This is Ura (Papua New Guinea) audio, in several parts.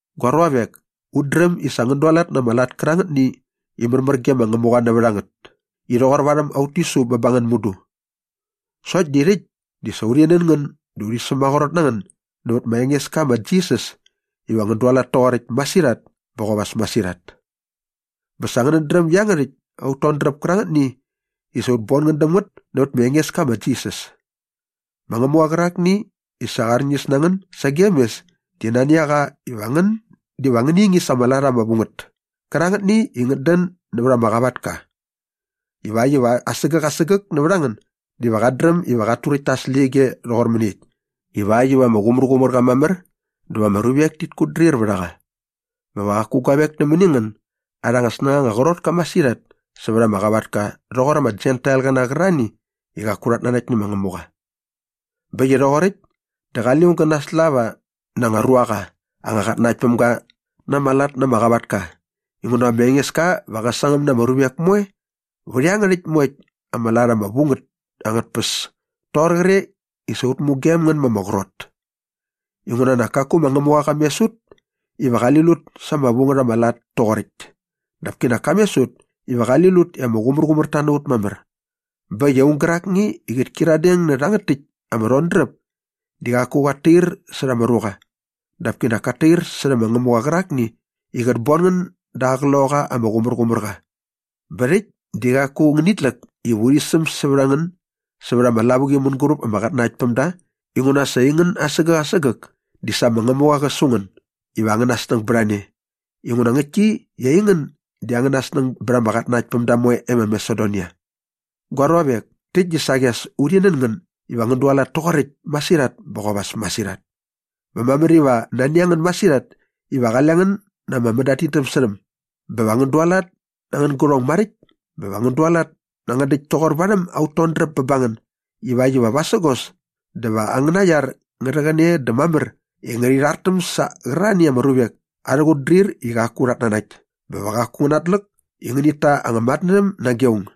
Gua ruavek, ut dräm i sa ngän dualat na ama lat kärangätni i märmär ge ma Ngämuqa nävät a ngät i rhoqor värhäm aut tisu bä ba ngän mudu. Sokt di rhäkt di sa urhi nän ngän dä urhi sämaqrot na ngän nävät ma Engeska ma Jisas iva ngän dualat toqoräkt masirhat bä qop as masirhat. Bä sa ngänät dräm iangärhäkt aut todräp kärangätni i sa ut bon ngän däm ngät nävät ma Engeska ma Jisas. Ma Ngämuqa qärakni i sa qa arñis na ngän sagem mes di nani a qa iva ngän diva ngäni ngingis ama lat ama vu ngät kärangätni i ngät dän nävät ama qavatka ivakt iva asägäk asägäk nävät a ngän diva qat dräm iva qat turäkt ta aa släqyige rhoqor mäniekt ivakt iva ama qumärqumär qa mamär dä va ama ruvek tit kutdrir vät a qa bä va qaku guavek nämäni ngän arhä snängaqa ama qrot ka masirhat sävät ama qavatka rhoqor ama Jentailqäna qärarhani i qaku rhat nanakt nä ma Ngämuqa. Bä äkt i rhoqoräkt dä qale aung gä naslava na aa anga ruaqa anga qatnanaktpämga na ama lat na ama qavatka inguna ma Engeska va qä sangäm na ama ruvek moe vät iangärhäkt moekt ama lat ama vu ngät angät tpäs toqor qre i sa ut mugem ngän ma ama qrot. Inguna nak kaku ma Ngämuqa qa mes ut iva qali lut sa ama vu ngät ama lat toqoräkt dap kinak ka mes ut iva qali lut i ama qumärqumärta na ut mamär. Bä äkt i aung gärakni i qät kyiradeng nä rhangät täkt ama rhodräp di qaku qat tair särha ama ruqa dap kinak kat tair särhä ma Ngämuqa qärakni i qät bon ngän da aa Qloqaqa ama Qumärqumärqa. Bä rhäkt di qaku ngänit läk iva urhi säm sävät a ngän sävät ama lavuqi mänguräp ama qatnanaktpämda inguna sa aingän asägäk asägäk di sa ma Ngämuqa qa su ngän iva angäna snäng bät a ne inguna ngäktki i aingän di angäna snäng bät ama qatnanaktpämda moe e ma Masedonia. Gua ruavek, täkt di saqi as urhi nän ngän iva ngän dualat toqoräkt masirhat bä qop as masirhat. Bä mamär iva nani a ngän masirhat iva qale ngän na ama mänadidämsärhäm bä va ngän dualat na angän gärhong maräkt bä va ngän dualat na angän däkt toqor varhäm aut todräp bä ba ngän ivakt iva vasägos dä va angäna iar ngä rhäqäne dä mamär i ngärhi rhartäm sä qärarhani ama ruvek arhä qutdrir i qaku rhat nanakt bä va qaku ngän natläk iva ngänit ta anga matnärhäm nage aung.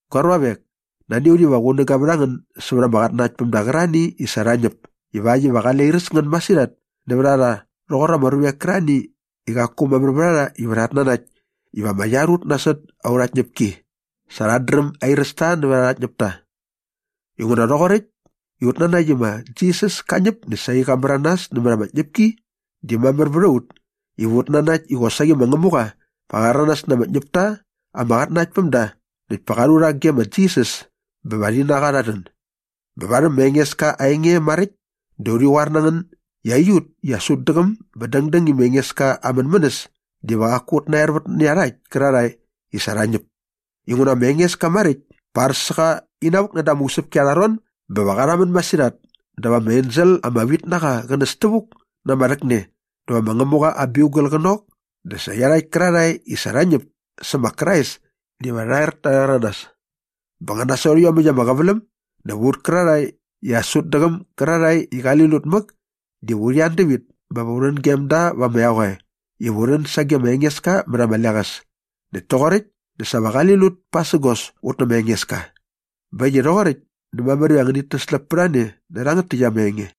Gua ruavek, nani a ut iva qunäga vät a ngän sävät ama qatnanaktpämda qärarhani i sa rha ñäp ivakt iva qale airäs ngän masirhat nävät a rha rhoqor ama ruvek kärarhani i qaku mamär vät a rha iva rhat nanakt iva ama iar ut nasot aurha tñäpki sa rhat dräm airäs ta nävät arha ñäpta. Inguna rhoqoräkt i ut nanakt i ma Jisas ka ñäp dä saqi qa märanas nämät ama tñäpki di mamär vät a ut iva ut nanakt i qosaqi ma Ngämuqa va qa rhäranas na ama ñäpta ama qatnanakt päm da näkt pa qa rhu rha ge ma Jisas bä va rhi na qa rha rhän. Bä varhäm ma Engeska aa enge maräkt dä urhi qoar na ngän i aiut i as ut däqäm bä dängdäng i ma Engeska aa mänmänäs diva qaku ut naervät nä iarhakt kärarhae i sa rha ñäp inguna ma Engeska maräkt pa ar sä qa inavuk näda ama usäpki arha ron bä va qa rhamän masirhat dä va ama ensel ama vit na qa qä näs tävuk na ama rhäkne dä va ma Ngämuqa aa biugal qä nok dä sa iarhakt kärarhae i sa rha ñäp sä ma Krais diva rha er ta rhäranas. Bä nga nasot iomäkt ama qäväläm dä va ut kärarhae i as ut däqäm gärarhae i qali lut mäk diva urhi an dävit bä va u rhän gem da va ama eqoe iva u rhän sage ma Engeska mät ama leqäs. Näkt toqoräkt dä sa va qali lut pasägos ut nä ma Engeska. Bä äkt i rhoqoräkt dä mamär iva ngänit täsläp pät a ne nä rhangät täkt ama enge.